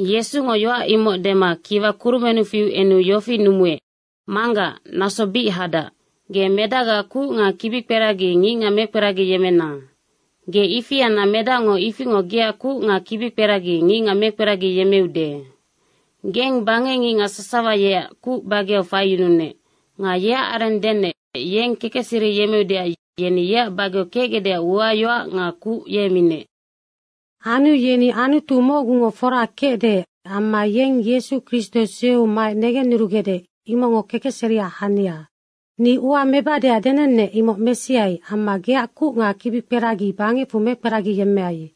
Yesungo yoac imoc dema kiwa kurumennu fiu enu yofi numuec, “Manggac, naso bic hadac. Ge medacgaac kuc nga kibikperagi ngicngac mekperagiyemmena. Ge ifi anna Medacngo ifingoc geac kuc nga kibikperagi ngicngac mekperagiyemmeude. Geng bangecngicngac sasawa yeac kuc bageau faiyununec. Nga yeac areng denec yeng kekecseri yemmeudeac yeni yeac bageau kecgecdeac uayoac nga kuc ye minec. Anu yeni Anutu mocgungo fora kecde amma yeng Yesu Kristo sueu maec negennurugecde, imocngo kekecseriac hania. Ni ua mebadeac denennec, imoc mesiai amma geac kuc nga kibikperagi bangecfu mekperagiyemmeai.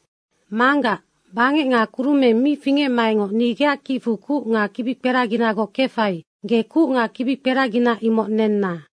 Manggac, bangec nga kurumeng mi fingecmaecngoc ni geac kicfu kuc nga kibikperaginagoc kefai, ge kuc nga kibikperagina imoc nenna.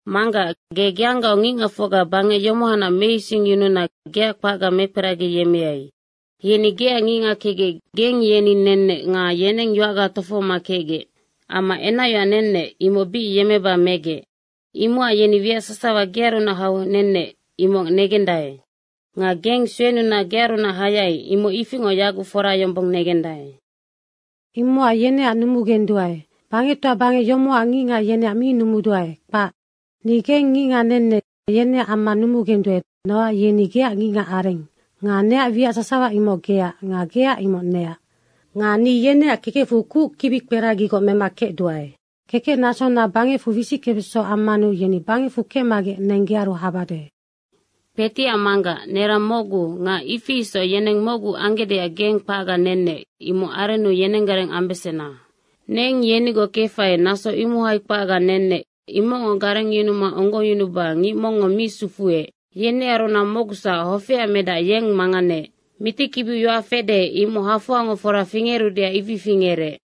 Manggac, ge geanggaoc ngicngacfocga bangec yomohacnac meisingyununa geac kpacga mekperagiyemmeai. Yeni geac ngicngac kecgec geng yeni nennec nga yeneng yoacga tofohoma kecgec. Amma enacyoac nennec, imoc bic yemmeba megec. Imocac yeni wiac sasawa gearunac hau nennec, imoc negendae. Nga geng suenuna gearunac hayai, imoc ifingoc yaguc fora yombong negendae. Imocac yeneac numugenduae. Bangectoa bangec yomocac ngicngac yeneac mi numuduae, kpac. Ni geng ngicngac nennec, yeneac amma numugenduae nocac yeni geac ngicngac areng nga neac wiac sasawa imoc geac nga geac imoc neac. Nga ni yeneac kekecfu kuc kibikperagigoc mema kecduae. Kekecnasona bangecfu wisickebeso ammanu yeni bangecfu kecmagec neng gearu habade. Kpetiac Manggac, nerang mocgu nga ifi isoc yeneng mocgu anggecdeac geng kpacga nennec, imoc arennu yenenggareng ambesena. Neng yenigoc kefai, naso imohai kpacga nennec, imocngo garengyunuma onggongyunuba ngic mongngo mi sufuec. Yenearunac mocgusac, hofeac medac, yeng manganeec. Mitikibiu yoac fede, imoc hafoangoc fora fingerudeac ifi fingerec.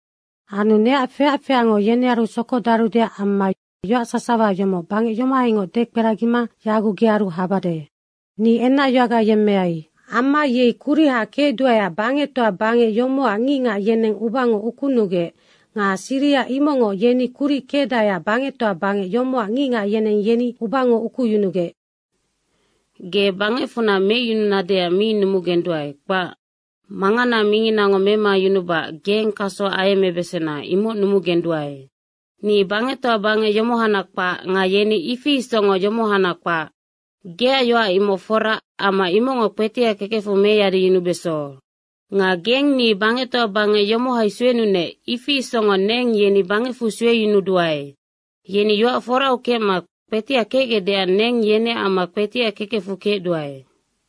Anu neac feac feacngo yenearu sokodarudeac amma yoac sasawa yomoc bangec yomohaingoc dekperagima yaguc gearu habade. Ni enacyoacga yemmeai. Amma yei kuriha kecduaeac bangectoa bangec yomocac ngicngac yeneng ubango ukunugec nga siriha imocngoc yeni kuric kecdaeac bangectoa bangec yomocac ngicngac yeneng yeni ubango ukuyunugec. Ge bangecfunac meicyununadeac mi numugenduae, kpac. Manganaac minginango memayunubacac geng kaso ayemmebesena, imoc numugenduae. Ni bangectoa bangec yomohanac kpac nga yeni ifi isocngoc yomohanac kpac. Geac yoac imoc fora amma imocngo kpetiac kekecfu meyadiyunubeso. Nga geng ni bangectoa bangec yomohai suenunec, ifi isocngoc neng yeni bangecfu sueyunuduae. Yeni yoac forau kecma kpetiac kecgecdeac neng yeneac amma kpetiac kekecfu kecduae.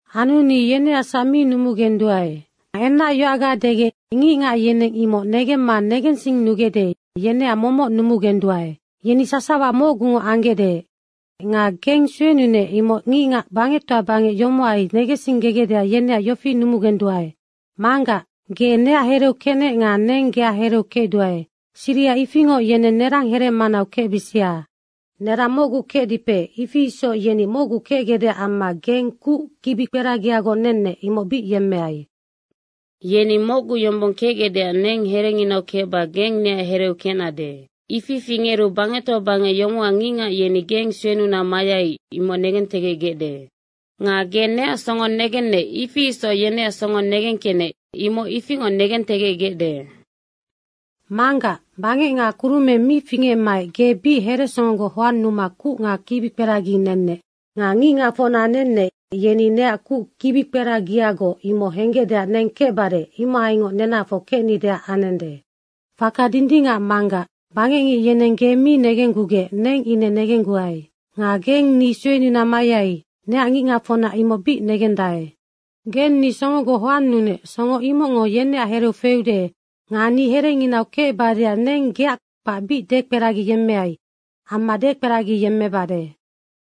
Anu ni yeneacsac mi numugenduae. Nga enacyoacga degec ngicngac yeneng imoc negemma negensinnugecde, yeneac momoc numugenduae. Yeni sasawa mocgungoc anggecde nga geng suenunec, imoc ngicngac bangectoa bangec yomohai negensinggegecdeac yeneac yofi numugenduae, Manggac, ge neac hereu kecnec nga neng geac hereu kecduae, siriha ifingoc yeneng nerang here manau kecbisia. Nerang mocgu kecdipe, ifi isoc yeni mocgu kecgecdeac amma geng kuc kibikperagiagoc nennec, imoc bic yemmeai. Yeni mocgu yombong kecgecdeac neng herenginau kecba geng neac hereu kecnade. Ifi fingeru bangectoa bangec yomocac ngicngac yeni geng suenuna mayai, imoc negentegecgecde. Nga ge neac songo negennec, ifi isoc yeneac songo negengkecnec, imoc ifingoc negentegecgecde. Manggac, bangec nga kurumeng mi fingecmaec ge bic heresongogoc hoannuma kuc nga kibikperagi nennec. Nga ngicngacfocna nennec, yeni neac kuc kibikperagiagoc imoc henggecdeac neng kecbade, imohaingoc nenahafoc kecnideac anende. Faka dindingacac Manggac, bangecngic yeneng ge mi negenggugec neng ine negengguai. Nga geng ni suenuna mayai, neac ngicngacfocna imoc bic negendae. Geng ni songogoc hoannunec, songo imocngo yeneac hereu feude nga ni herenginau kecbadeac neng geac kpac bic dekperagiyemmeai amma dekperagiyemmebade.”